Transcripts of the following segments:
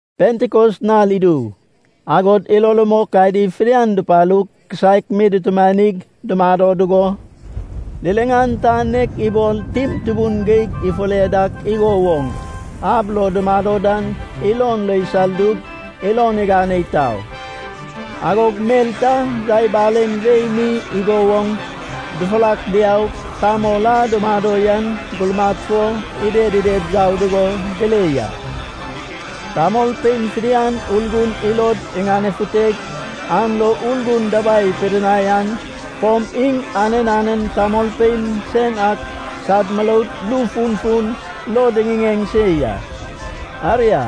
Pentikos nal idu, agog ilo rumok adi fidian dupalug, kisaek mi dutumanig dumado dugo, liliŋan ta nek ibol tim tubun geig ifure dak igo woŋ ab lo dumado dan ilon lo isaldug ilon igane itau. Agog mel ta yai balen wei mi igo woŋ dufurak diaug tamol a dumado yan gurmad fo ided ided yau dugo dile ya. Tamolpein fidian Urgun ilod iŋanefuteg an lo Urgun dabai ipidinai an fom iŋ anen anen tamolpein sen ak sad muroud ru funfun lo diŋiŋeŋ se ya. Aria,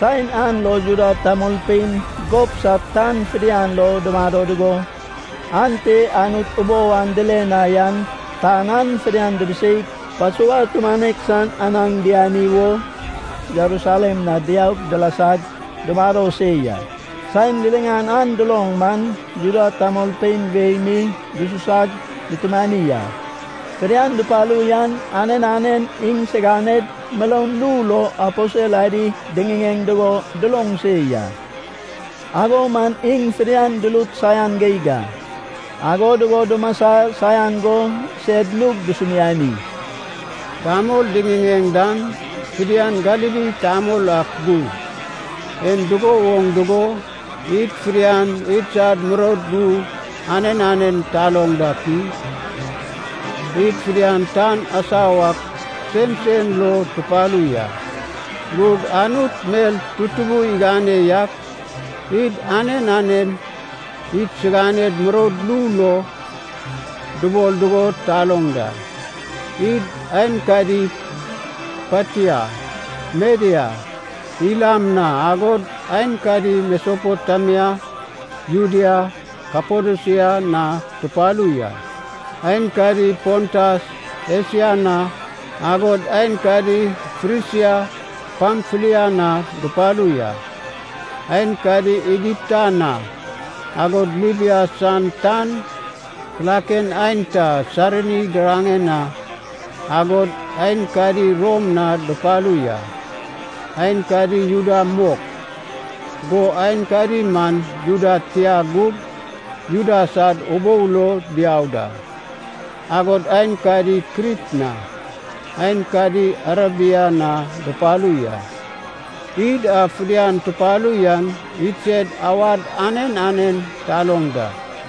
saen an lo Juda tamolpein gob sad tan fidian lo dumado dugo, ante Anut ubou an dile na yan tan an fidian dibiseig Pasova tumanek san anaŋ diani wo Jerusalem na diaug dilasag dumado se ya. Saen liliŋan an duloŋ man, Juda tamolpein wei mi dususag dutumani a. Fidian dupalu yan anen anen iŋsiganed muroud ru lo aposel adi diŋiŋeŋ dugo duloŋ se ya, ago man iŋ fidian durut saian geig a. Ago dugo dumasa saian go sed nug dusumiani, “Tamol diŋiŋeŋ dan fidian Galili tamol ak gug, en dugo woŋ dugo id fidian idsad muroud ru anen anen taloŋ dak i? Id fidian tan asau ak sensen lo tupalu ya. Gug Anut mel tutubun igane yak id anen anen idsiganed muroud ru lo dubol dugo taloŋ da. Id aenkadi Patia, Media, Ilam na, agod aenkadi Mesopotemia, Judea, Kapadosia na tupalu ya. Aenkadi Pontas, Esia na, agod aenkadi Frisia, Pamfilia na dupalu ya. Aenkadi Igipta na, agod Libia san tan kilaken aenta Sairini giraŋen na, agod aenkadi Rom na dupalu ya. Aenkadi Juda mok, go aenkadi man Juda tia gug Juda sad ubou lo diau da. Agod aenkadi Krit na, aenkadi Arebia na dupalu ya. Id a fidian tupalu yan idsed awad anen anen taloŋ da.”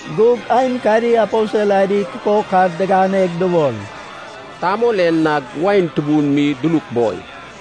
Gug aenkadi aposel adi kukok ad diganeg dubol, “Tamol en nag wain tubun mi duluk boi.”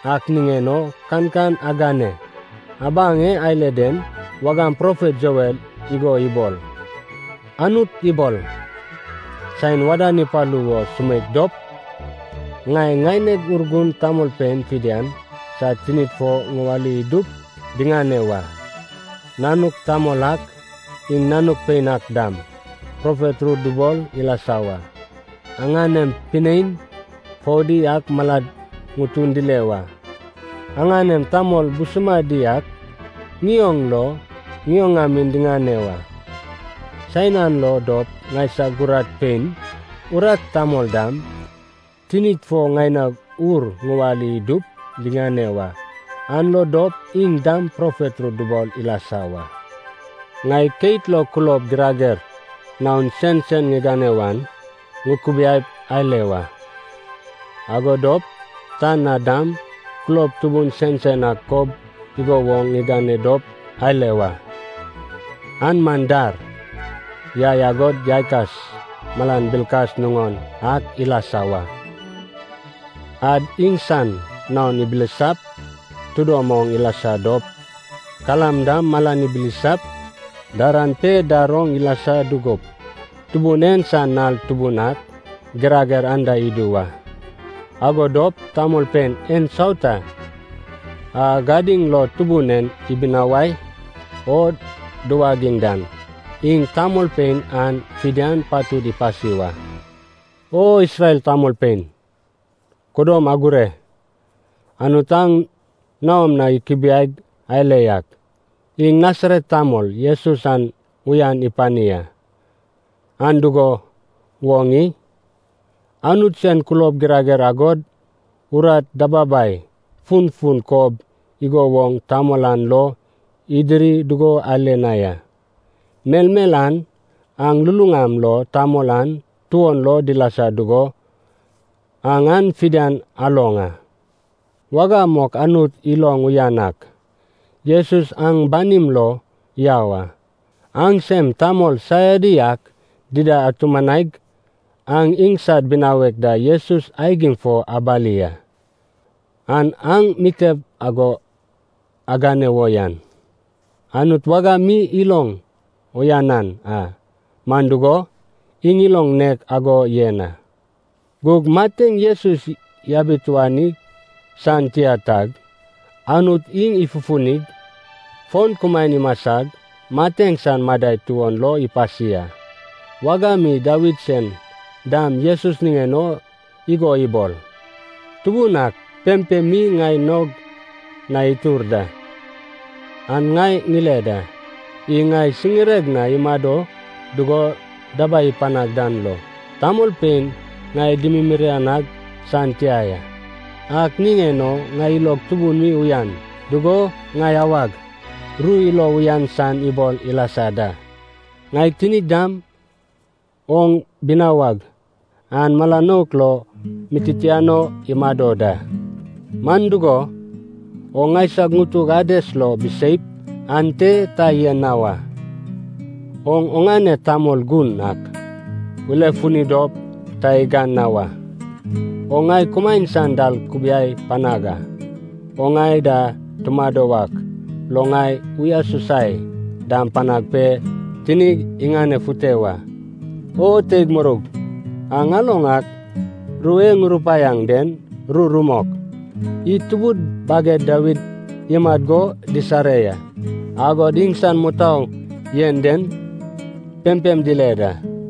Ak niŋen o kankan agane. Abaŋ e ale den wagam profet Joel igo ibol: “Anut ibol, ‘Saen wadan ipalu wo sumeik dop, ŋai ŋaineg Urgun tamolpein fidian sad tinid fo ŋuwali idup diŋane wa. Nanuk tamol ak, iŋ nanuk pein ak dam profet ru dubol ilasa wa. Aŋanem pinein foudi ak malad ŋutun dile wa. Aŋanem tamol busumadi ak ŋioŋ lo ŋioŋamin diŋane wa. Saen an lo dop ŋaisag urat pein, urat tamol dam, tinid fo ŋaineg Ur ŋuwali idup diŋane wa. An lo dop iŋ dam profet ru dubol ilasa wa. Ŋai keit lo kulob girager naon sensen ŋigane wan ŋukubiai ale wa. Ago dop tan na dam kulob tutubun sensen ak kob igo woŋ ŋigane dop ale wa. An man dar, yai, agod yaikas malan bilkas nuŋon ak ilasa wa. Ad iŋsan naon ibilisap tidom oŋ ilasa dop, kalam dam malan ibilisap, daran pe dar oŋ ilasa dugup, Tubun en san nal tubun ak girager anda idu wa. Ago dop tamolpein ensauta a gadiŋ lo Tubun en ibinawai o duwagiŋ dan, iŋ tamolpein an fidian patud ipasi wa.’ “O Isrel tamolpein, kudom agure! Anut aŋ naom na ikubiaig ale yak, iŋ Nasaret tamol Jesus an uyan ipani a. An dugo woŋ i? Anut sen kulob girager agod urat dababai funfun kob igo woŋ tamol an lo idiri dugo ale na ya. Melmel an aŋ luluŋam lo tamol an tuon lo dilasa dugo aŋ an fidian aloŋ a. Wagam mok Anut iloŋ uyanan ak, Jesus aŋ banim lo yau a. Aŋsem tamol saiadi ak dida atumanaig aŋ iŋsad binawek da Jesus aigim fo abali a. An aŋ mitep ago agane wo yan Anut wagam mi iloŋ uyanan a, man dugo, iŋ ilon nek ago yen a. Gug mateŋ Jesus yabituani san tia tag Anut iŋ ifufunig, fon kumaen imasag mateŋ san madai tuon lo ipasi a. Wagam mi Dawid sen dam Jesus niŋen o igo ibol, ‘Tubun ak pempem mi ŋai naog na itur da, an ŋai ŋile da. Iŋ ŋai siŋireg na imado dugo dabai ipanag dan lo, tamolpein ŋai dimiriranag san tia ya. Ak niŋen o ŋai ilog tubun mi uyan dugo ŋai awag, ru ilo uyan san ibol ilasa da. Ŋai tinig dam oŋ binawag an mala nouk lo mi ititiano imado da. Man dugo, oŋ ŋaisag ŋutug Ades lo biseip ante ta yen na wa. Oŋ oŋane Tamol Gun ak ulefuni dop ta igan na wa. Oŋ ŋai kumaen san dal kubiai panag a. Oŋ ŋai da tumado wak lo ŋai uyasusai dam panag pe tinig iŋanefute wa.’” “O teig muroug, aŋ aloŋ ak ru e ŋurupaiaŋ den ru rumok, id tubud baged Dawid imat go disare ya. Agod iŋsan mutou yen dan pempem tile da.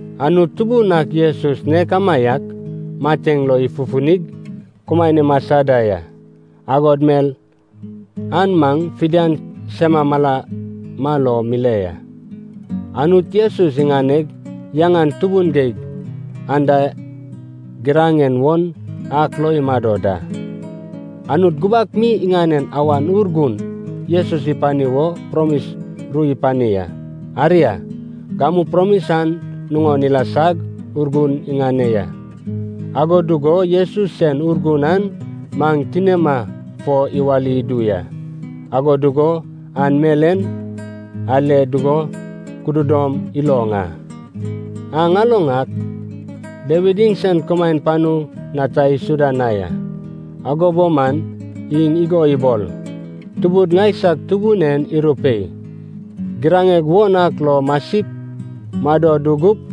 Anut Tubun ak Jesus nek amaiak mateŋ lo ifufunig, kumaen imasa da ya. Agod mel an maŋ fidian sema malama lo mile ya. Anut Jesus iŋaneg yaŋan tubun geig anda giraŋen won ak lo imado da. Anut gubak mi iŋanen Awan Urgun Jesus ipani wo promis ru ipani a. Aria, gamu promis an nuŋon ilasag Urgun iŋane ya. Ago dugo Jesus sen Urgun an maŋ tinima fo iwali idu ya, ago dugo aŋ mel en ale dugo kududom iloŋ a. Aŋ aloŋ ak Dawid iŋsen kumaen panu na ta isuda na ya. Ago bo man iŋ igo ibol, ‘Tubud ŋaisag Tubun en irupei: giraŋeg won ak lo masip, mado dugup,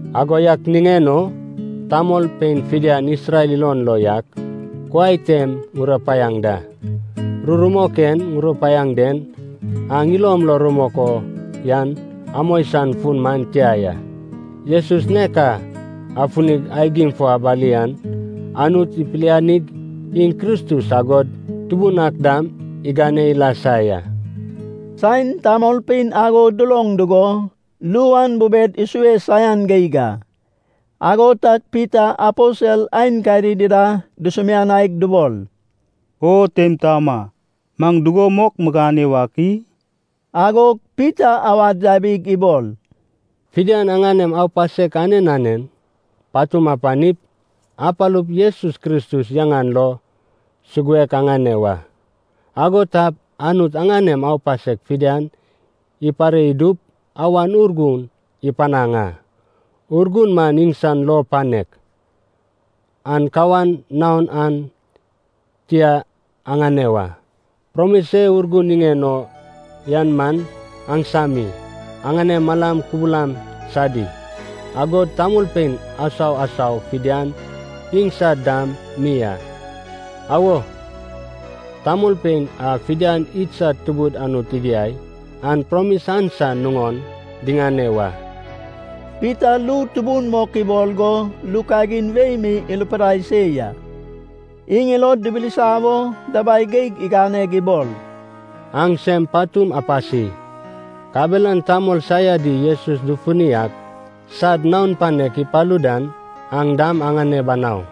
“Ago yak niŋen o tamolpein fidian Isrel ilon lo yak kuai tem ŋurupaiaŋ da, ru rumok e ŋurupaiaŋ den aŋ ilom lo rumok o yan amoi san fun man tia ya. Jesus nek a afunig aigim fo abali an, Anut ipilianig iŋ Kristus agod Tubun ak dam igane ilasa ya.” Saen tamolpein ago duloŋ dugo, ru an bubed isue saian geig a, ago tag Pita aposel aenkadi dida dusumianaig dubol, “O teim taoma, maŋ dugo mok migane wak i?” Agog Pita awad yabig ibol, “Fidian aŋanem aupasek anen anen patum apanip, apalup Jesus Kristus yaŋan lo suguek aŋane wa. Ago tap Anut aŋanem aupasek fidian ipare idup Awan Urgun ipanaŋ a. Urgun man iŋsan lou panek, an kawan naon an tia aŋane wa. Promis e Urgun niŋen o yan man aŋsami, aŋanem malam kubulam sadi, agod tamolpein asau asau fidian iŋsad dam mi a. Awo, tamolpein a fidian idsad Tubud Anut igiai an promis an san nuŋon diŋane wa.” Pita ru tubun mok ibol go ru kagin wei mi irupidai se ya. Iŋ ilod dibilisa wo dabai geig iganeg ibol, “Aŋ sem patum apasi. Kabelan tamol saiadi Jesus dufuni ak sad naon panek ipalu dan aŋ dam aŋane banau.”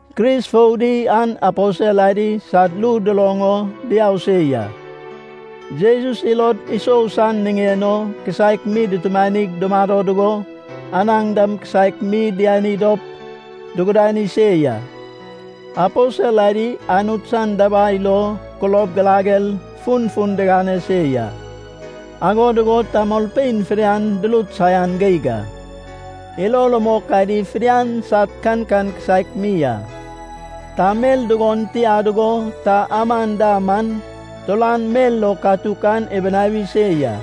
Kris foudi an aposel adi sad ru duloŋ o diau se ya. Jesus ilod isou san niŋen o kisaek mi dutumanig, dumado dugo, anaŋ dam kisaek mi diani dop dugudani se ya. Aposel adi Anut san dabai lo kulob girager funfun digane se ya. Ago dugo tamolpein fidian durut saian geig a. Ilo rumok adi fidian sad kankan kisaek mi a. Ta mel dugon tia dugo ta aman da man, turan mel lo katuk an ibinawi se ya.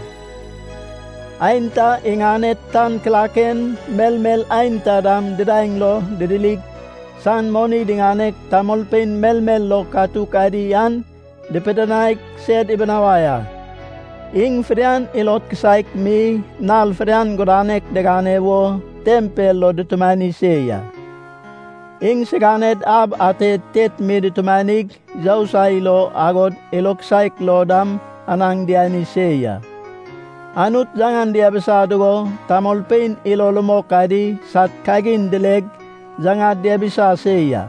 Aenta iŋaned tan kilaken, melmel aenta dam didaeŋ lo didirig, san moni diŋaneg, tamolpein melmel lo katuk adi an dipidinaig sed ibinawai a. Iŋ fidian ilod kisaek mi nal fidian gudanek digane wo tempel lo dutumani se ya. Iŋsiganed ab ate tet mi dutumanig yousai lo agod ilod kisaek lo dam anaŋ diani se ya. Anut yaŋan diabisa dugo tamolpein ilo rumok adi sad kagin dileg yaŋad diabisa se ya.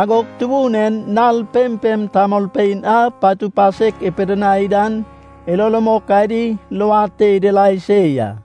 Agog Tubun en nal pempem tamolpein a patu pasek ipidinai dan ilo rumok adi luad te idirai se ya.